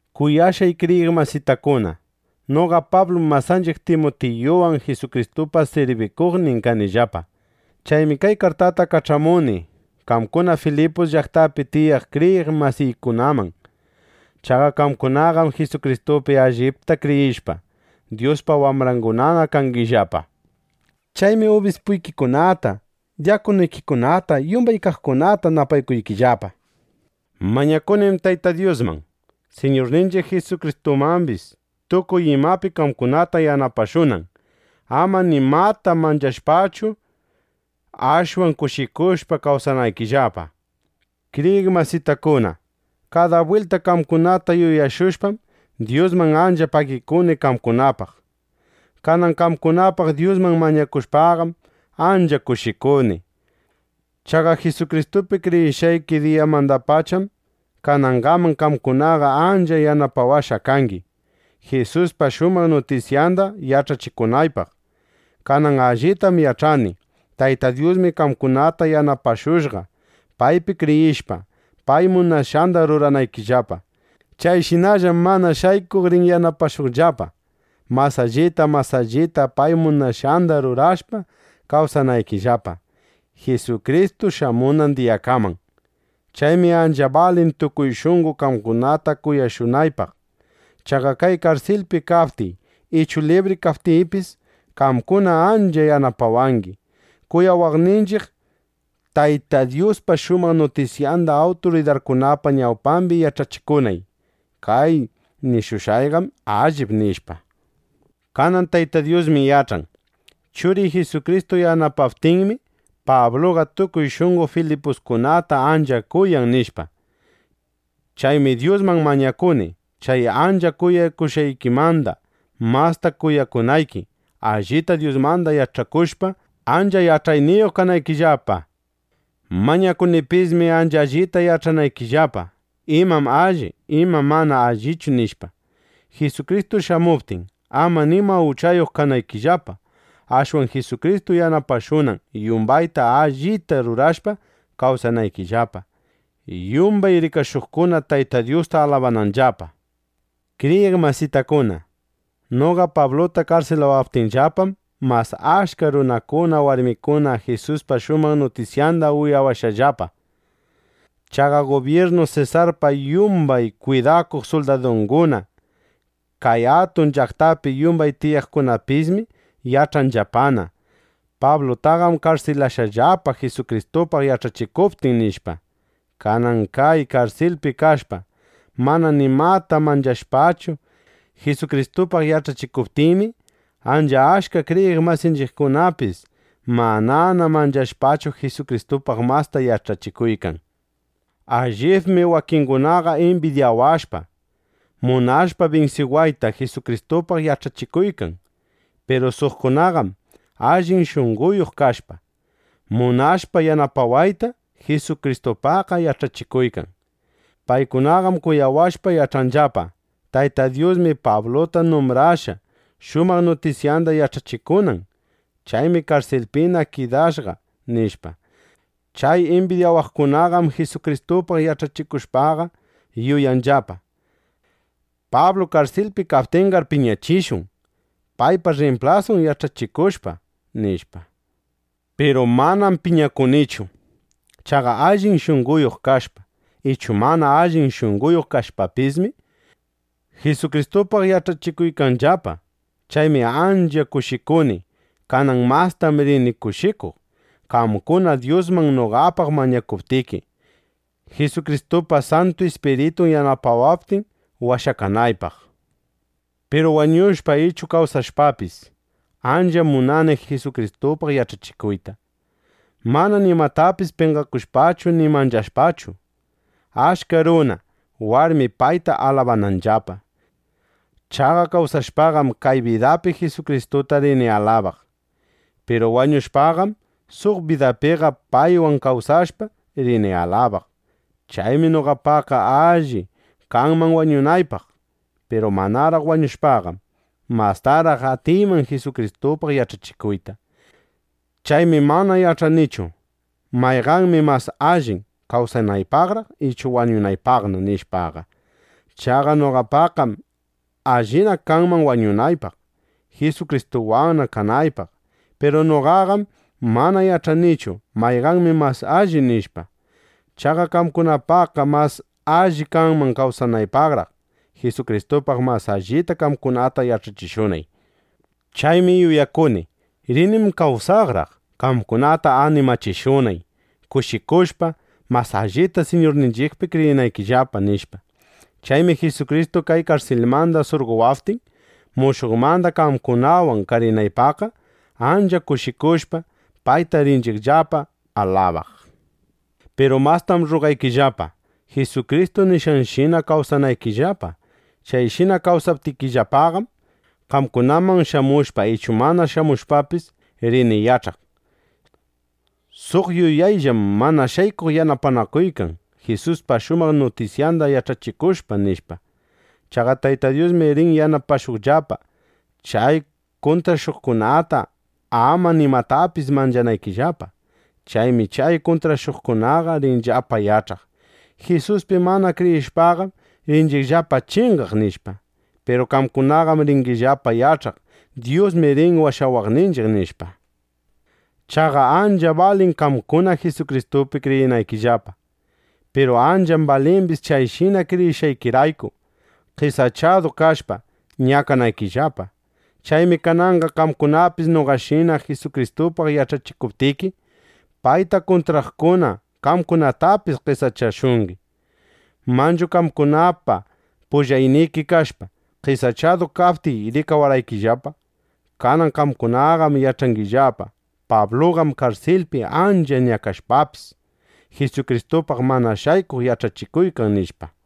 Kuyashqay kriyiq masitakuna, noqa Pablum masanchiq Timutiyuwan Jisukristupa sirbikuqnin kanillapa. Chaymi kay kartata kach'amuni qamkuna Filipus llaqtapi tiyaq kriyiq masiykunaman. Chaqa qamkunaqam Jisukristupi allipta kriyishpa, Dyuspa wambrangunana kangillapa. Chaymi ubispuykikunata, dyakunuykikunata, yumbay qamkunata napaykuykillapa. Mañakunim Tayta Dyusman, Siñurninchiq Jisukristumambis, tukuy imapi qamkunata yanapashunan, ama nimata manchashpachu, ashwan kushikushpa kawsanaykillapa. Kriyiq masitakuna, kada bwilta qamkunata yuyashushpam, Dyusman ancha pagikuni qamkunapaq. Kanan qamkunapaq Dyusman mañakushpaqam, ancha kushikuni. Chaqa Jisukristupi kriyishqayki diyamandapacham kanangaman qamkunaqa ancha yanapawashqa kangi, Jisuspa shumaq nutisyanda yach'achikunaypaq. Kanan allitam yach'ani: Tayta Dyusmi qamkunata yanapashushqa, paypi kriyishpa, pay munashqanda ruranaykillapa. Chayshinallam mana shaykuq rin yanapashuqllapa, mas allita mas allita pay munashqanda rurashpa, kawsanaykillapa, Jisukristu shamunan diyakaman. Chaymi ancha balin, tukuy shunqo qamkunata kuyashunaypaq. Chaqa kay karsilpi kaptiy ichu libri kaptiypis, qamkuna ancha yanapawangi, kuyawaqninchiq Tayta Dyuspa shumaq nutisyanda awturidarkunapa ñawpambi yach'achikunay: “Kay nishushqayqam allip”, nishpa. Kanan Tayta Dyusmi yach'an: Churiy Jisukristu yanapaptinmi, Pabluqa tukuy shunqo filipusinukunata ancha kuyan, nishpa. Chaymi Dyusman mañakuni, chay ancha kuyakushqaykimanda masta kuyakunayki, allita Dyusmanda yach'akushpa, ancha yach'ayniyuq kanaykillapa. Mañakunipismi, ancha allita yach'anaykillapa, imam alli, imam mana allichu, nishpa, Jisukristu shamuptin, ama nima uchayuq kanaykillapa, ashwan Jisukristu yanapashunan, yumbayta allita rurashpa kawsanaykillapa, yumbay rikashuqkuna Tayta Dyusta alabananllapa. Kriyiq masitakuna, noqa Pabluta karsilawaptinllapam, mas achka runakuna, warmikuna Jisuspa shumaq nutisyanda uyashqallapa. Chaqa gubyirnu Sesarpa yumbay kwidakuq suldadunguna, kay atun llaqtapi yumbay tiyaqkunapismi yach'anllapana: Pablutaqam karsilashqallapa, Jisukristupaq yach'achikuptin, nishpa. Kanan kay karsilpi kashpa, mana nimata manchashpachu, Jisukristupaq yach'achikuptiymi, ancha achka kriyiq masinchiqkunapis, manana manchashpachu, Jisukristupaq masta yach'achikuykan. Allibmi wakingunaqa imbidyawashpa, munashpa binsiwayta, Jisukristupaq yach'achikuykan. Piru suqkunaqam, allin shunqoyuq kashpa, munashpa yanapawayta, Jisukristupaqqa yach'achikuykan. Paykunaqam kuyawashpa, yach'anllapa: Tayta Dyusmi Pabluta numbrashqa, shumaq nutisyanda yach'achikunan. Chaymi karsilpina kidashqa, nishpa. Chay imbidyawaqkunaqam Jisukristupaq yach'achikushpaqa yuyanllapa: Pablu karsilpi kaptinqar piñachishun, paypa rrimplasun yach'achikushpa, nishpa. Piru manam piñakunichu. Chaqa allin shunqoyuq kashpa, ichu mana allin shunqoyuq kashpapismi, Jisukristupaq yach'achikuykanllapa. Chaymi ancha kushikuni. Kanan mastam rini kushikuq, qamkuna Dyusman noqapaq mañakuptiki, Jisukristupa Santu Ispiritun yanapawaptin washakanaypaq. Piru wañushpa ichu kawsashpapis, ancha munani Jisukristupaq yach'achikuyta, mana nimatapis penqakushpachu ni manchashpachu, achka runa, warmi payta alabananllapa. Chaqa kawsashpaqam, kay bidapi Jisukristuta rini alabaq. Piru wañushpaqam, suq bidapiqa paywan kawsashpa, rini alabaq. Chaymi noqapaqqa alli kanman wañunaypaq. Piru manaraq wañushpaqam, mastaraq atiyman Jisukristupaq yach'achikuyta. Chaymi mana yach'anichu: Mayqanmi mas allin, kawsanaypaqraq ichu wañunaypaqna, nishpaqa. Chaqa noqapaqqam allina kanman wañunaypaq, Jisukristuwanna kanaypaq. Piru noqaqam mana yach'anichu: Mayqanmi mas alli, nishpa. Chaqa qamkunapaqqa mas alli kanman kawsanaypaqraq, Jisukristupaq mas allita qamkunata yach'achishunay. Chaymi yuyakuni: Rinim kawsaqraq, qamkunata animachishunay, kushikushpa, mas allita Siñurninchiqpi kriyinaykillapa, nishpa. Chaymi Jisukristu kay karsilmanda surqowaptin, mushuqmanda qamkunawan karinaypaqqa, ancha kushikushpa, payta ringillapa alabaq. Piru mastam rrugaykillapa, Jisukristu nishqanshina kawsanaykillapa. Chayshina kawsaptikillapaqam, qamkunaman shamushpa ichu mana shamushpapis, rini yach'aq: Suq yuyayllam mana shaykuq yanapanakuykan, Jisuspa shumaq nutisyanda yach'achikushpa, nishpa. Chaqa Tayta Dyusmi rin yanapashuqllapa, chay kuntrashuqkunata ama nimatapis manchanaykillapa. Chaymi chay kuntrashuqkunaqa rinllapa yach'aq: Jisuspi mana kriyishpaqam, rinchiqllapa chingaq, nishpa. Piru qamkunaqam ringillapa yach'aq: Dyusmi rin washawaqninchiq, nishpa. Chaqa ancham balin qamkuna Jisukristupi kriyinaykillapa. Piru ancham balimbis chayshina kriyishqaykirayku, qesachadu kashpa, ñakanaykillapa. Chaymi kananqa qamkunapis noqashina Jisukristupaq yach'achikuptiki, payta kuntraqkuna qamkunatapis qesachashungi. Manchu qamkunapa pullayki kashpa, qesachadu kaptiy rikawarqaykillapa. Kanan qamkunaqam yach'angillapa: Pabluqam karsilpi ancha ñakashpapis, Jisukristupaq mana shaykuq yach'achikuykan, nishpa.